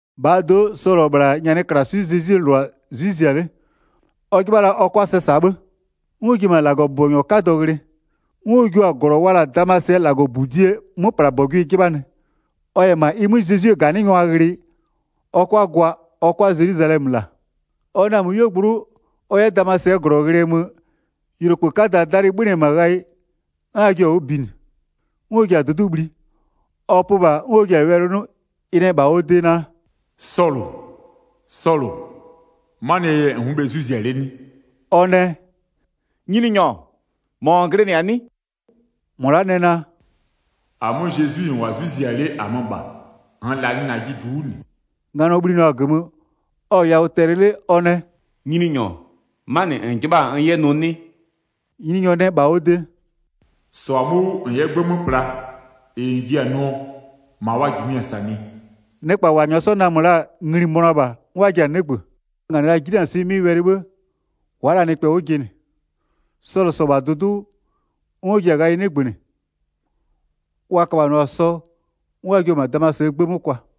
1-Bhaa do'o, Sɔlʋ-ɔ -bhla nyanɩklaswɩ'ɩ Zezwie -lʋa 'zwɩ zia 'le, ɔ 'jɩbha la ɔ 'kʋa sɛ -saa 'bhë. 'N ɔ ji-e -ma -Lagɔbʋbɔnyɔ 'kadɔ ghlɩ. 'N ɔ jio-a -glɔ wa la-a Damasɩɛ -Lagɔbudie 'möplabɔgʋɩ 'jɩbhanɩ, ɔ -yɛ -ma ɩ 'mö Zezwie -ganɩngwa ghlɩ, ɔ 'kʋa gwa ɔ 'kʋa Zelwizalɛmö -la. Ɔ namö 'yuogblʋ'ʋ ɔ 'yɛ Damasɩɛ -glɔ ghlɩɛ mö-ö, yʋlokpë 'kadaa 'dalɩ 'bhönɩ -ma ghayɩ, 'n ɩ jio-a 'wʋ binɩ. 'N ɔ ji-a dʋdʋ'ʋ bhli, ɔ pö -bha 'n ɔ ji-a wɛlɩ 'nʋ, ɩ nɛ -bha ɔ de naa: “Sɔlʋ, Sɔlʋ, 'manɩɛ yɛ -n wʋ'ʋ bhe 'zwɩ zia 'le 'nɩ?” Ɔ nɛ: “Nyininyɔ, -mɔ -n glɩnɩ-a 'nɩ?” -Mɔ la'a nɛ naa: “-Amö Zezwi-i -n -wʋ-a 'zwɩ zia 'le -amö -bha, -nn -lanɩ -najɩ -du 'wʋ -nɩ.” Nganɔ bhlinɩɔ-a -gömö, ɔ-ɔ yawʋ tɛlɩ 'le ɔ nɛ: “Nyininyɔ 'manɩ -n 'jɩbha-a n 'yɛ nʋ 'nɩ?” Nyininyɔ nɛ -bha ɔ de: “-Sɔ-a 'mö 'wʋ, -n 'yɛ 'gbë 'mö pla, -ɩ -n ji-a nʋɔ, -ma n -jimɩ-a -sanɩɛ.” Nɩkpa -wa -nyɔɔ namö la-a ngli-i mönʋa -bha, 'n wa ji-a 'nɩgbö. Wa -nganɩ la 'jinanɩswɩ'ɩ 'mɩ wɛlɩ 'bhë-ë, wa'a la nɩkpɛ 'wʋ jɩnɩ. Sɔlʋ -sɔ-ɔ -bha dʋdʋ'ʋ 'wʋ, 'n ɔ ji-a ghayɩ 'nɩgbönɩ, wa köbhanɩɔ-a sɔ, 'n wa jio-o -ma Damasɩɛ 'gbë 'mö kwa.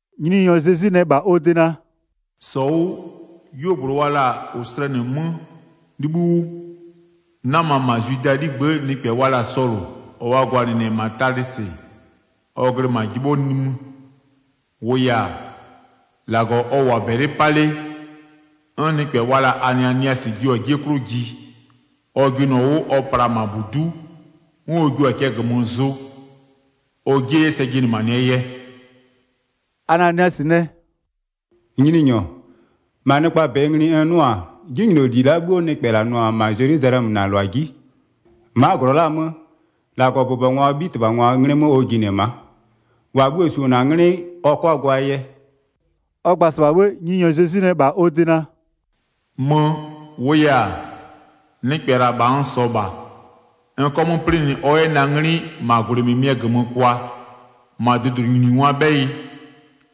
Nyininyɔ Zezwi nɛ -bha ɔ de naa: “-Sɔ 'wʋ, 'yuogblʋ wa la-a -ʋ slɛnɩ 'mö 'libhïʋ 'wʋ, 'nama -ma Zwidaa 'ligbë'ë nɩkpɛ wa la-a Sɔlʋ, -ɔ wa gwalɩnɩ-ɛ -ma Talɩsɩ, ɔ glɩ -ma 'jɩbhɔ nimï. -Wʋʋ yɛ-a, -Lagɔ ɔ -wʋ-a -bɛlɩ 'pa 'le, 'n nɩkpɛ wa la-a Ananiasɩ jio-a 'jie 'klʋ ji. Ɔ jɩnɩɔ 'wʋ, ɔ pla-a -ma -budu'u 'n ɔ jio-a cɛ -gömö zʋ, ɔ 'jie 'yɛ sɛ jɩnɩmanɩɛ yɛ.” Ananiasɩ nɛ: “Nyininyɔ, -ma nɩkpaa -bɛ ngli n 'nʋ-a 'jinyloli la'a 'bhuo nɩkpɛ -la nʋ-ɔ -ma Zelwizalɛmö -na -lʋa 'ji. Ma'a -glɔ la'a 'mö, -Lagɔbʋbɔngwaa 'bhitɩbhangwaa 'nglɩ 'mö ɔ jinɩ-ɛ ma'a, -wa bhuo-o -su-o -na 'nglɩ, ɔ 'kʋa gwaa yɛ.” Ɔ gba-a -sɩbha, Nyininyɔ Zezwi nɛ -bha ɔ de naa: “Mö, -wʋʋ yɛ-a, nɩkpɛ -la, -bha n -sɔɔ -bha, n 'kɔ 'mö 'plɩnɩ ɔ 'yɛ na 'nglɩ -ma -gwlɩ -mɩmɩɛ -gömö kwa, -ma dʋdʋɩnyiningwaa 'bhɛyɩ,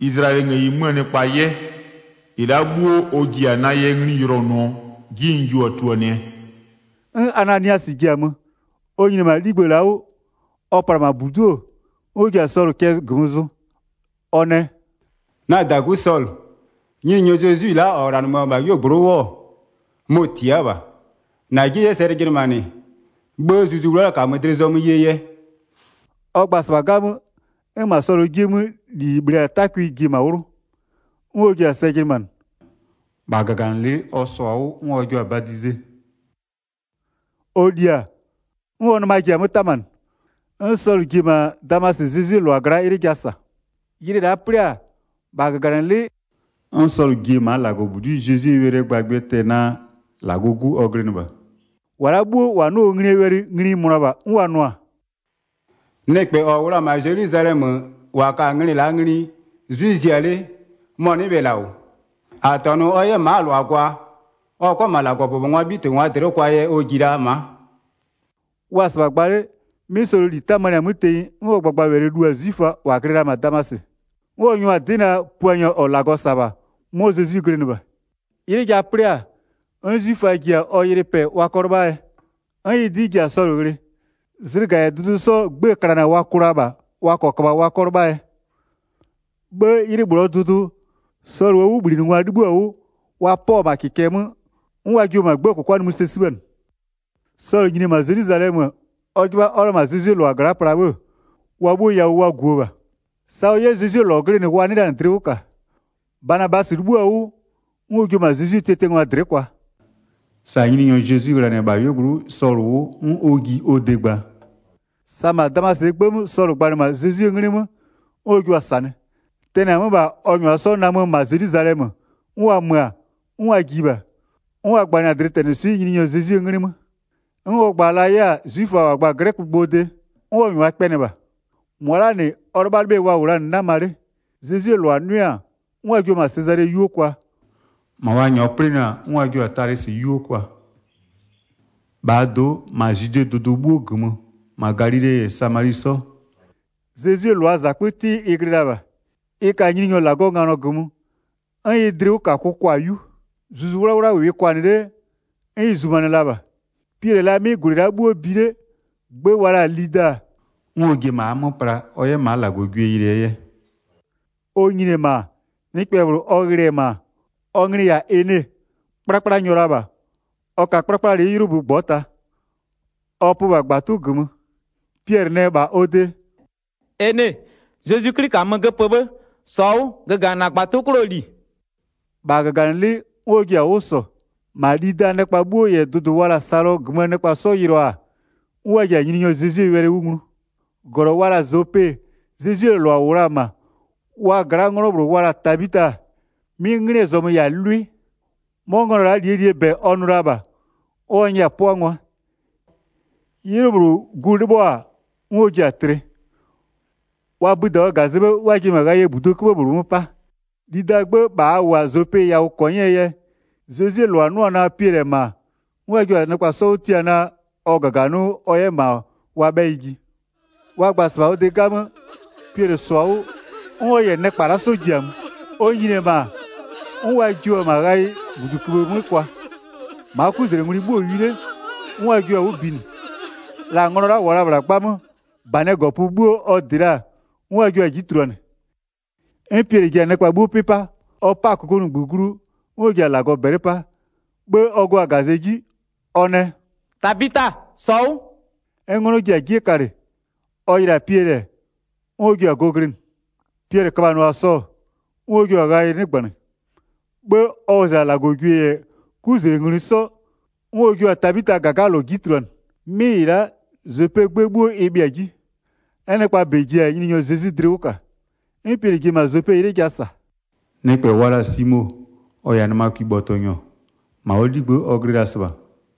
Izlayɛlɩɛ ngëyi 'möö nɩkpa 'yɛ. 16-Ɩ la'a 'bhuo ɔ ji-a na yɛ ngli yʋlɔnʋɔ 'ji n jio-a tuluanɩɛ.” 'N Ananiasɩ ji-a mö, ɔ nyini-e -ma 'ligbë la'aa 'wʋ, ɔ pla-a -ma -budu'u-o, 'n ɔ ji-a Sɔlʋ cɛ -gömö zʋ, ɔ nɛ: “Na -dagu Sɔlʋ, Nyininyɔ Zezwi-i la'a -ɔ -ghlanɩmö-ö -bha 'yuogblʋ'ʋ 'wʋ-ɔ, mɔ-ɔ tia'a -bha, -na 'jie 'yɛ sɛ jɩnɩmanɩ, 'bhë Zuzu 'Wlawla -kamö dlɩ zɔmö yee yɛ.” Ɔ gba-a sa'a 'gamö, 'n -ma Sɔlʋɔ 'jie 'mö -li -ɩ -bhle-a 'takwɩ ji-e -ma 'wlʋ, 'n ɔ ji-a sɛ jɩnɩmanɩ. -Bha -gaganɩlɩ'ɩ ɔ -sɔ-a 'wʋ 'n wa jio-a badize. Ɔ li-a, 'n ɔ nɩma ji-a 'mö 'tamanɩ. 'N Sɔlʋ ji-e -ma Damasɩ Zezwie -lʋa gla'a 'ylɩ ja -sa. Ylɩ la'a 'plɩ-a, -bha -gaganɩlɩ'ɩ 'n Sɔlʋ ji-e -maa -Lagɔbudi'i Zezwie wɛlɩɛ gbagbɩɛ tɛ-ɛ naa -Lagɔɔ 'Gu ɔ glɩnɩ -bha. 21-Wa la'a 'bhuo -wa 'nʋ-a ɔ nglie wɛlɩ ngli-i mönʋa -bha, 'n wa nʋ-a: “Nɩkpɛ -ɔ -wʋ la-a -ma Zelwizalɛmö -wa ka-a nglɩ la'a ngli 'zwɩ zia 'le, mɔ-ɔ 'nɩ bhe -la -wʋ? -A -tɔnʋ ɔ 'yɛ ma'aa -lʋa gwa, ɔ 'kʋa -ma -Lagɔbʋbɔngwaa 'bhitɩbhangwa dlɩ'ɩ kwaa yɛ ɔ ji la ma'a?” Wa-a -sɩbha gba 'le 'bhë, 'mɩ Sɔlʋɔ -li 'tamanɩ-a 'mö tenyi 'n ɔ gbagbawɛlɩ lu-a 'zwiföa -wa glɩ la-a -ma Damasɩ. 'N ɔ nyʋa-a 'dɩ naa, Puanyɔ -ɔ -Lagɔ -sa-a -bha, 'mɔ Zezwi glɩnɩ -bha. 'Ylɩ ja 'plɩ-a, 'n 'zwiföa ji-a ɔ ylɩ pɛ wa 'kɔ 'lɩbhaa yɛ. 'N ɩ 'dɩ ji-a Sɔlʋ ghlɩ. Zlɩga -yɛ dʋdʋ 'sɔ 'gbëë klana wa kʋ la -bha, wa 'kɔ köbha wa 'kɔ 'lɩbhaa yɛ. 'Bhë 'ylɩ -bhlʋɔ dʋdʋ, Sɔlʋɔ 'wʋbhlinɩngwa 'libhïɔ-a 'wʋ, wa 'pɔ-ɔ -ma -kɩkɛ 'mö, 'n wa jio-o -ma 'gbëë -kʋkwa nimï sɛ 'sibhanɩ. Sɔlʋ nyini-e -ma Zelwizalɛmö-ö, ɔ 'jɩbha ɔ 'yɛ la -ma Zezwie -lʋa gla'a pla 'bhë-ë, wa 'bhuo yawʋ wa guo la -bha. Sa ɔ 'yɛ Zezwie -lɔ glɩnɩ wa 'nɩɩ la dlɩ 'wʋ -ka. Banabasɩ 'libhïo-a 'wʋ, 'n ɔ jio-o -ma Zezwie tiatiangwa dlɩ'ɩ kwa. Sa Nyininyɔ Zezwi ghlanɩ-ɛ -bha 'yuogblʋ'ʋ Sɔlʋ 'wʋ 'n ɔ ji ɔ de gba, sa -ma Damasɩɛ 'gbë 'mö Sɔlʋ gbanɩ-a dlɩtɛnɩswɩ'ɩ Zezwie 'nglɩ 'mö, 'n ɔ jua-a -sanɩ. Tɛnɩ-a 'mö -bha, ɔ -nyʋa 'sɔ namö -ma Zelwizalɛmö, 'n wa mö-a, 'n wa ji -bha, 'n ɔ gbanɩ-a dlɩtɛnɩswɩ'ɩ Nyininyɔ Zezwie 'nglɩ 'mö. 'N ɔ gba la 'yɛ-a 'zwiföa -wa gba-a 'glɛkögbʋɔ de, 'n ɔ -nyʋa kpɛnɩ -bha. -Mʋa la'aa -nɩ ɔ 'lɩbhalɩbhɩɛ wa -wʋ la-a 'nama 'le. Zezwie -lʋa 'nʋɩ-a, 'n wa jio-o -ma Sezale 'yuo kwa, -ma wa -nyɔɔ 'plɩnɩ-a 'n wa jio-a Talɩsɩ 'yuo kwa. 'Kplakplanyɔ Ene yɛ 'pʋ 31-Bhaa do'o, -ma Zwidee dʋdʋ 'bhuo -gömö, -ma Galile -yɛ Samali 'sɔ, Zezwie -lʋaa -zakpö 'tɩ ɩ glɩ la -bha. Ɩ ka Nyininyɔ -Lagɔɔ nganɔ -gömö, 'n ɩ dlɩwʋkakʋ kwa-a 'yu. Zuzu 'Wlawla -wɩɩ kwanɩ 'le, 'n ɩ zumanɩ la -bha. Piɛlɩ-ɛ la 'mɩ -gwlɩ la'a 'bhuo bi 'le, gbë wa la-a Lida, 'n ɔ ji-e -ma a 'mö pla ɔ 'yɛ -maa -Lagɔgwie yɩlɩɛ yɛ. Ɔ nyini-e -ma, nɩkpɛ -bhlʋ ɔ ghlɩ-ɛ -ma, ɔ nglɩ-ɩ -yɛ-a Ene, 'kplakplanyɔ la -bha, ɔ ka 'kplakplalɩ'ɩ 'ylʋbö -ngbɔta, ɔ pö -bha -gbatʋ -gömö. Piɛlɩ nɛ -bha ɔ de: “Ene, Zezwi 'Kli -kamö göpö 'bhë, -sɔ 'wʋ, göganɩ -na -gbatʋ 'klʋɔ -li.” -Bha -gaganɩlɩ'ɩ 'n ɔ ji-a 'wʋ -sɔ. 35-Ma Lidaa nɩkpa 'bhuo -yɛ dʋdʋ wa la-a Salɔ -gömöö -lʋa 'sɔ yɩlɩɔ-a, 'n wa ji-a Nyininyɔ Zezwie wɛlɩ 'wʋ nglu. Tabita yɛ galɔ 36-Glɔ wa la-a Zope, Zezwie -lʋa -wʋ la-a -ma, wa gla'aa 'nglɔ -bhlʋ wa la-a Tabita, 'mɩ 'nglɩɛ zɔmö -yɛ-a lwɩ. 'Mɔ nglɔ la'a -lie -lie -bɛ ɔ nʋ la -bha, 'n ɔ nyɛ-a 'pʋangwa. 'Ylɩ -bhlʋ, gu 'lɩbhɔ-a 'n ɔ ji-a tlɩ. Wa bïda-a ɔ -gazɛ 'bhë 'n wa ji-e -ma -buduo ghayɩɛ 'köbhë -bhlʋ 'mö 'pa. Lidaa 'gbë -bha a -wʋ-a Zope yawʋ -kɔnyɩɛ yɛ, Zezwie -lʋa 'nʋ-ɔ naa Piɛlɩ-ɛ -ma-a, 'n wa jio-a nɩkpa 'sɔ 'wʋ tia naa, ɔ -gaganɩ 'wʋ ɔ 'yɛ -ma wa 'bhɛyɩ ji. Wa gba-a -sɩbha ɔ de 'gamö, Piɛlɩ -sɔ-a 'wʋ, 'n ɔ -yɛ nɩkpa la'a 'sɔ ji-a mö. Ɔ nyini-e -ma, 'n wa jio-o -ma ghayɩɛ -buduköbhë 'mö kwa. -Maa 'kuzlengwlɩ 'bhuo-o wi 'le, 'n wa jio-a 'wʋ binɩ. La nglɔ la'a -wʋʋa la-a -bhla 'gbamö, -banɩɛ -gɔpö 'bhuo ɔ dɩ la-a, 'n wa jio-a 'ji tuluanɩ. 'N Piɛlɩ ji-a nɩkpa 'bhuo 'pɩ 'pa. Ɔ 'pa-a -kokomunigbö glu, 'n ɔ ji-a -bɛlɩ 'pa. 'Bhë ɔ gö-a -gazɛ 'ji, ɔ nɛ: “Tabita, -sɔ 'wʋ!” 'N 'nglɔ ji-a 'jie kalɩ, ɔ yɩlɩ-a Piɛlɩ-ɛ, 'n ɔ ji-a go glɩnɩ. Piɛlɩ köbhanɩɔ-a sɔ, 'n ɔ jio-a ghayɩ 'nɩgbanɩ. 'Bhë, ɔ wɔzɩ-a -Lagɔgwie -yɛ 'kuzlengwlɩ 'sɔ, 'n ɔ jua-a Tabitaa -gagalɔ 'ji tuluanɩ. 'Mɩ -ɩ la'a, Zopee 'gbë 'bhuo ɩ bhɩa-a 'ji. 'N nɩkpaa -bɛ ji-a Nyininyɔ Zezwi dlɩ 'wʋ -ka. 'N Piɛlɩ ji-e -ma Zope 'ylɩ ja -sa nɩkpɛ wa la-a Simo, -ɔ -yɛ-a nɩmakwibhɔtɔnyɔ, -ma ɔ 'ligbë'ë ɔ glɩ la-a -sɩbha.